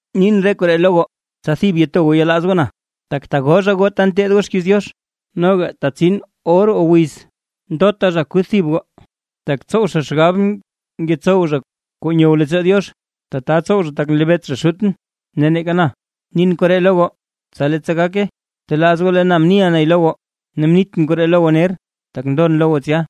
’Nin re koree lo goo, tsa thib to goo yelaaz goo na. Tak tagoo zha goo ta nteed zha xkiiz Diox, noga tetsin or o wiz ndota zha kuth thib goo, tak tsow zha xgab ngetsow zha kuu nyow leettsoo Diox. Tata tsow zha tak nlebeet zha Xutʼn ne neeka na. Nin koree lo goo, tsa leettsa gake, telaaz goo lee na mniʼa nay lo goo, ne mnitʼn koree lo goo ner, tak ndon lo goo tsya.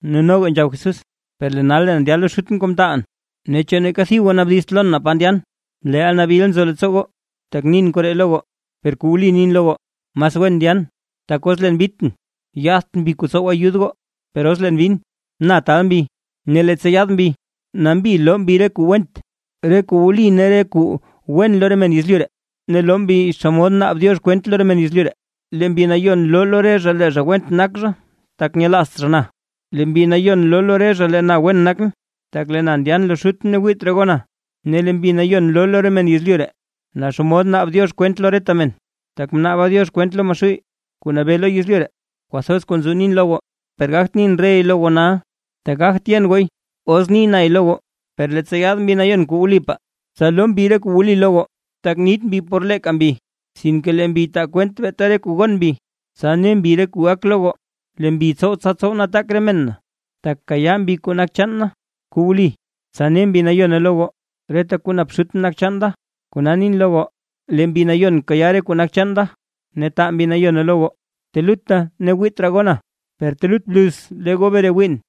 Ne noga nzhab Jesús: ―Per lee nal leen ndya lo Xutʼn kuu mtaalʼn, ne ¿chu neeka thib goo naabdizt lon naa pa ndyan? Leel nabil nzo leettsoo goo, tak nin koree lo goo. Per kuu wli nin lo goo, mas wen ndyan. Tak os leen bitʼn yaadt Mbi kuu tsow ayud goo, per os leen bin, na taal Mbi. Ne leettsa yaad Mbi, nambi loo Mbi re kuu went, re kuu wli ne kuu wen lo re men yezlyu ree, ne loo Mbi xomod naab Diox kwent lo re men yezlyu ree. Lee Mbi Nayon loo lo re zha lee zha went nak zha, tak nyelaazt zha na. Ne lee Mbi Nayon loo lo re zha lee na wen nakʼn, tak lee na ndyan lo Xutʼn ne wiit raa goo na; Ne lee Mbi Nayon loo lo re men yezlyu ree, naa xomod naab Diox kwent lo reta men, tak mnaaba Diox kwent loo Maxuuy kuu nabee lo yezlyu ree. ’Kwathoz kuu nzo nin lo goo, per gagt nin rey lo goo nal, tak gagt yen gooy os ni nay lo goo. Per leettsa yaad Mbi Nayon kuu wlipaa, tsa loo Mbi re kuu wli lo goo, tak nit Mbi por leeka lee Mbi, sinke lee Mbi taa kwent beeta re kuu gon Mbi, tsa ne Mbi re kuu gak lo goo. Lee Mbi tsow tsa tsow nataak re men na, tak kayaa Mbi kuu nak chaan da kuu wli tsa ne Mbi Nayone lo goo. Reta kuu nap Xutʼn nak chaan da, kona nin lo goo lee Mbi Nayon kayaa kuu nak chaan da ne taa Mbi Nayone lo goo. ’Telutta ne wiit raa goo na, per telut bluz lee goo bre wiiʼn.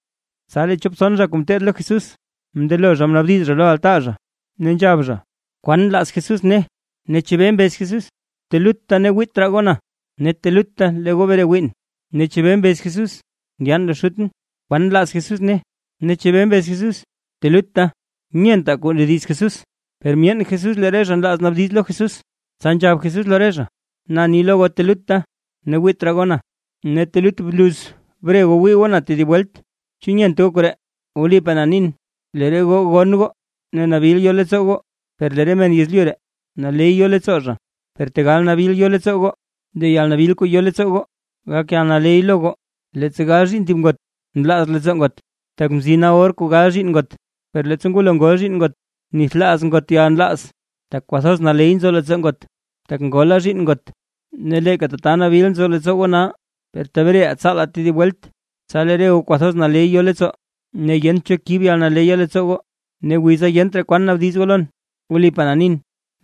Tsa lee chop tson zha kuu ngeteed lo Jesús, mndelo zha mnaabdiz zha lo altaa ne nzhab zha: ―¿Kwan nlaaz Jesús ne, ne chebee mbez Jesús? Telutta ne wiit raa goo na ne telutta lee goo bre wiin, ne ¿chebee mbez Jesús ndyan lo Xutʼn? ¿Kwan nlaaz Jesús ne, ne chebee mbez Jesús: “telutta”? Nyentaa kuu ndediz Jesús. Per myeen Jesús lee re zha nlaaz naabdiz lo Jesús, tsa nzhab Jesús lo re zha: ―Na ni lo goo telutta ne wiit raa goo na, ne telut bluz bre goo wii goo na tedib welt, ¿chu nyent goo koree? Wlipaa na nin, lee re goo gonn goo ne nabil yo leettsoo goo, per lee re men yezlyu ree naley yo leettsoo zha. Per tegal nabil yo leettsoo goo, ne lee yalnabil kuu yo leettsoo goo gak yalnaley lo goo. Leettsa gal zhiinn thib ngot, nlaaz leettsoo ngot tak mzina or kuu gal zhiinn ngot, per leettsa ngwalo ngol zhiinn ngot, nithlaaz ngot yalnlaaz, tak kwathoz naley nzo leettsoo ngot, tak ngola zhiinn ngot. Ne leeka tata nabil nzo leettsoo goo nal, per tebreʼaa tsaalaa tedib welt. Tsa lee re goo kwathoz naley yo leettsoo, ne yent cho kib yalnaleya leettsoo goo. ’Ne wiza yent raa kwan naabdiz goo lon. Wlipaa na nin,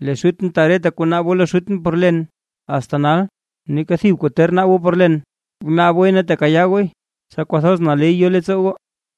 lee Xutʼn taa reta kuu naab goo lo Xutʼn por len. Asta nal, neeka thib kuu ter naab goo por len, bnaab gooy ne tekayaa gooy, tsa kwathoz naley yo leettsoo goo.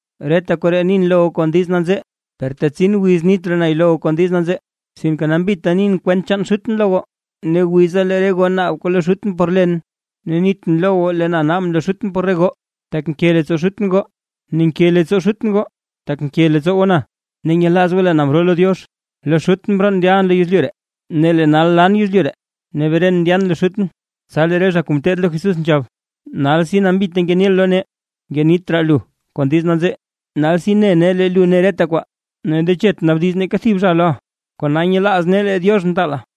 ’Reta koree nin lo goo kon diiz nanzee, per tetsin wiz kuu niit raa na lo goo kon diiz nanzee, sinke nambita nin kwent chaan Xutʼn lo goo. Ne wiza lee re goo naab kuu lo Xutʼn por len, ne niitʼn lo goo lee na naabʼn lo Xutʼn por re goo, tak nke leettsoo Xutʼn goo. Ne nke leettsoo Xutʼn goo, tak nke leettsoo goo na, ne nyelaaz goo leen mroo lo Diox. Lo Xutʼn mroon ndyalʼn lo yezlyu ree, ne lee nal lan yezlyu ree ne bren ndyan lo Xutʼn. Tsa lee re zha kuu ngeteed lo Jesús nzhab: ―Nalsi nambita ngeniʼa loo nee, ngenit raa lu kon diiz nanzee. Nalsi ne nee lee lu ne reta kwaa, ne ndechet naabdiz neeka thib zha loʼa. Kona nyelaaz nee lee Diox mtaala.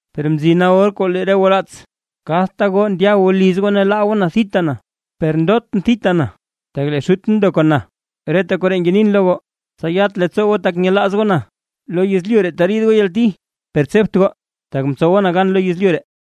Per mzina or kuu lee re goo raats, kadta goo ndya goo liz goo ne laa goo thita na. Per ndotʼn thita na, tak lee Xutʼn ndo kon na. Reta koree ngenin lo goo, tsa yat leettsoo goo tak nyelaaz goo na. Lo yezlyu ree teriid goo yalti, per tsebt goo, tak mtsowa na gan lo yezlyu ree.